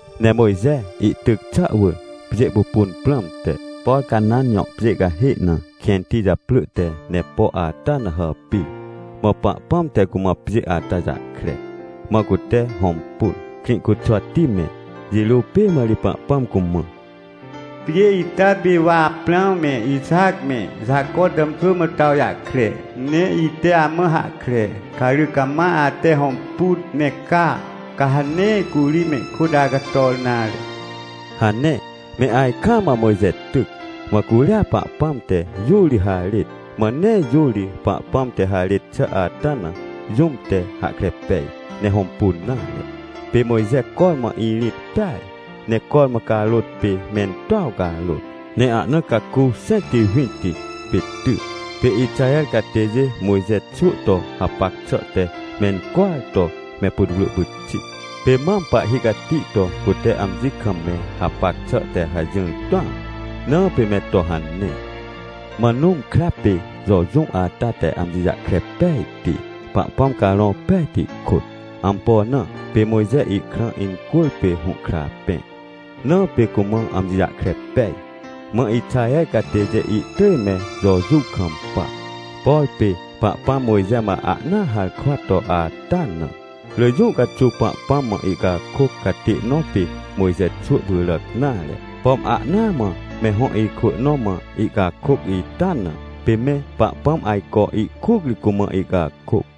Ne Mojxe ihtyc xà wỳr pjê pupun prãmte, por Canãnjõ pjê cahê na kẽnti japrỳ te Nepo ata na hàpir. Mã Pahpãm te cumãpjê ata jahkre, mã cute hõmpun, Krĩcuxwati me. Jirô pê mã ri Pahpãm cumã: — Pjê ita pê wa Aprãw me, Ixac me Jaco tàmxwỳmã to awjahkre, ne ite amã hahkre. Ca rỳ cama ate hõmpun, ne ca, ca ha nee curi mehkôtacator nare — hane. Me ajkaam mã Mojxe tyc, mãcuria Pahpãm te jũ ri harêt. Mã neejũ ri Pahpãm te harêt xà ata najũm te hahkre pej, ne hõmpun nare. Pê Mojxe cormãirĩt peaj, ne cormãcarôt pê mentuaw carôt, ne ahna caku xẽntiwinti pê ty. Pê Ixaher catêjêMojxe xwỳ to hapac xà te mencwỳar to me putwrỳ pyxit. Pêmam pahhi cati to cute amji kam me hapac xà te hajỹr tũam, na pê me tohane. Mã Nũm krapê Jojuw ata te amji jahkre pejti, Pahpãm Carõ Pejti kôt. Ampo na? PêMojxe ihkrã incwỳrpê hũhkra pẽ, na pê cumã amji jahkre pej. MãIxaher catêjê ihtỳj me Jojuw kampa, por pê Pahpãm Mojxe mã ahnaaharkwa to ata na. Rỳ jũ caxuw Pahpãm mã ihcakôc catê nõ pê Mojxe xwỳ pyràc nare. Pom ahnaa mã me hõ ikwỳ nõ mã ihcakôc ita na, pê me Pahpãm ajco ihkuc ri cumã ihcakôc.